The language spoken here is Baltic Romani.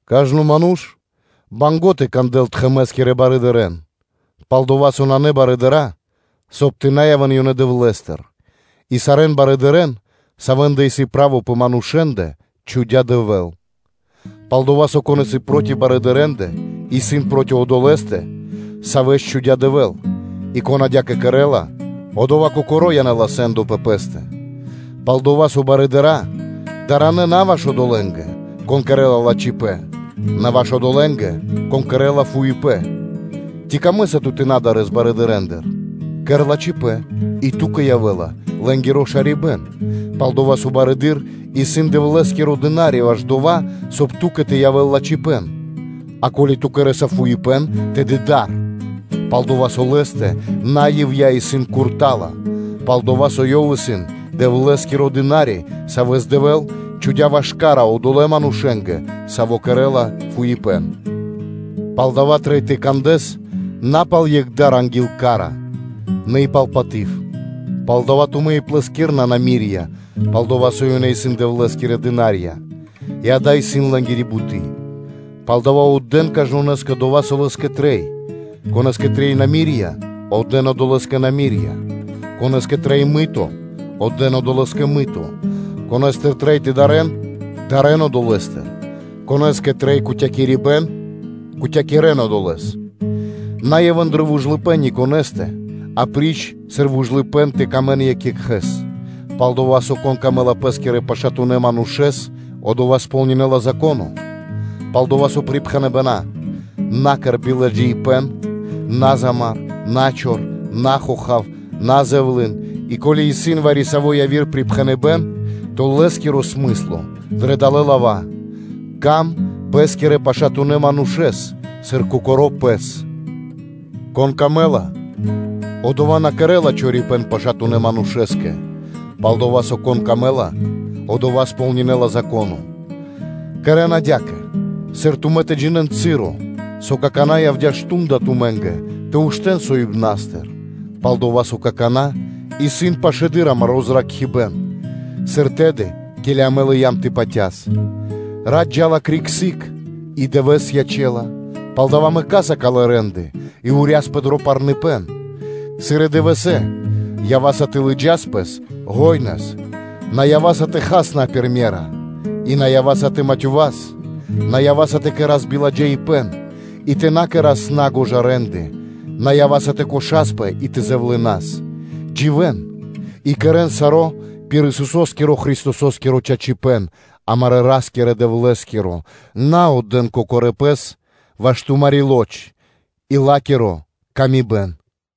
Кажно ману́ш исын банго́ (мусинэла) тэ кандэл тхэмэ́скирэ барыдырэ́н, пал-дова́ со нанэ дава́, соб (кай) тэ на явэ́н ёнэ Дэвлэ́стыр, и сарэ́н барыдырэ́н, савэ́ндэ исын право пэ манушэ́ндэ, чхудя́ Дэвэ́л. Палдава́ одова́, кон исын проти барыдырэндэ, исын проти одолэ́стэ, савэ́с чхудя́ Дэвэ́л; и кон адя́кэ кэрэ́ла, одова́ кокоро́ янэ́ла сэ́ндо пэ пэ́стэ. Пал-дова́ со барыдыра́ исын даранэ на ваш одолэ́нгэ, кон кэрэ́ла лачхипэ́н, на ваш одолэ́нгэ, кон кэрэ́ла фуипэ́н. Ци камэ́са ту тэ на дарэс барыдырэндыр? Кэр лачхипэ́н и ту́кэ явэ́ла лэ́нгиро шарибэ́н; пал-дова́ со барыдыро́ исын Дэвлэ́скиро дына́ри ваш дова́, соб (кай) ту́кэ тэ явэ́л лачхипэ́н. А ко́ли ту кэрэ́са фуипэ́н, тэды да́ро, пал-дова́ со лэ́стэ на ивья́ (на напра́снэс) исын курта́ла; пал-дова́ со ёв исын Дэвлэ́скиро дына́ри, савэ́с Дэвэ́л чхудя́ ваш ка́ра одолэ́ манушэ́скэ, саво́ кэрэ́ла фуипэ́н. Палдава́ трэй тэ кандэс на пал екх дар анги́л ка́ра, нэ и пал паты́в. Палдава́ тумэ́ и плэскирэна намирья (подати): пал-дова́ со ёнэ исын Дэвлэ́скирэ дына́рья, и ґа́да, исын лэ́нгири буты́. Палдава́ отдэ́н кажнонэ́скэ дова́, со лэ́скэ трэй: конэ́скэ трэй намирья (подати), отдэ́н одолэ́скэ намирья; конэ́стыр трэй мыто (оброко), отдэ́н одолэ́скэ мыто; конэ́стыр трэй тэ дарэ́н, дарэ́н одолэ́стыр; конэ́скэ трэй кутякирибэн, кутякирэн одолэ́с. На явэ́н дро вужлыпэ́н ни конэ́стэ апри́ч сыр вужлыпэ́н тэ сыкавэ́н паты́в екх екхэ́скэ: пал-дова́ со, кон сыкавэ́ла паты́в пэ́скирэ пашатунэ́ манушэ́скэ, одова́ сполнинэла Зако́но. Пал-дова́ со припхэныбэна́: “На кэр марки (биладжаипэ́н), на замар, на чор, на хохав, на зэвлын,” и, ко́ли исын вари-саво́ яви́р припхэныбэ́н, то лэ́скиро смысло дрэ далэ́ лава́: “Сыка́в паты́в пэ́скирэ пашатунэ́ манушэ́скэ, сыр кокоро́ пэ́скэ.” Кон сыкавэ́ла паты́в, одова́ на кэрэ́ла чорипэ́н пашатунэ́ манушэ́скэ, пал-дова́ со, кон сыкавэ́ла паты́в, одова́ сполнинэла Зако́но. Кэрэ́н адя́кэ, сыр тумэ́ тэ джинэ́н часо, со какана́ явдя́ мардо́ (шту́нда) тумэ́нгэ тэ уштэ́н соибнастыр; пал-дова́ со какана́ исын пашэдыр амаро́ зракхибэ́н, сыр тэды, ке́ли амэ лыям тэ патяс. Рат джа́ла криг сыг и дывэ́с ячэ́ла, палдава́ мэкаса калэ́ рэ́нды и урьясапэ дро парныпэн. Сыр и дывэсэ́, ява́са тэ лыджас пэс шука́р, на ява́са тэ хас на пир ме́ра, и на ява́са тэ матёвас, на ява́са тэ кэра́с марки и тэ кэра́с ладжавэ рэ́нды, на ява́са тэ выпробинас екх екхэ́с и тэ зэвлынас. Дживэ́н и кэрэ́н саро́ пир Исусо́скиро Христосо́скиро чачипэ́н, амарэ́ Ра́скирэ-Дэвлэ́скиро, на отдэ́н кокорэ́ пэс ваш тумари́ лоч и ла́киро тырдыпэ́н.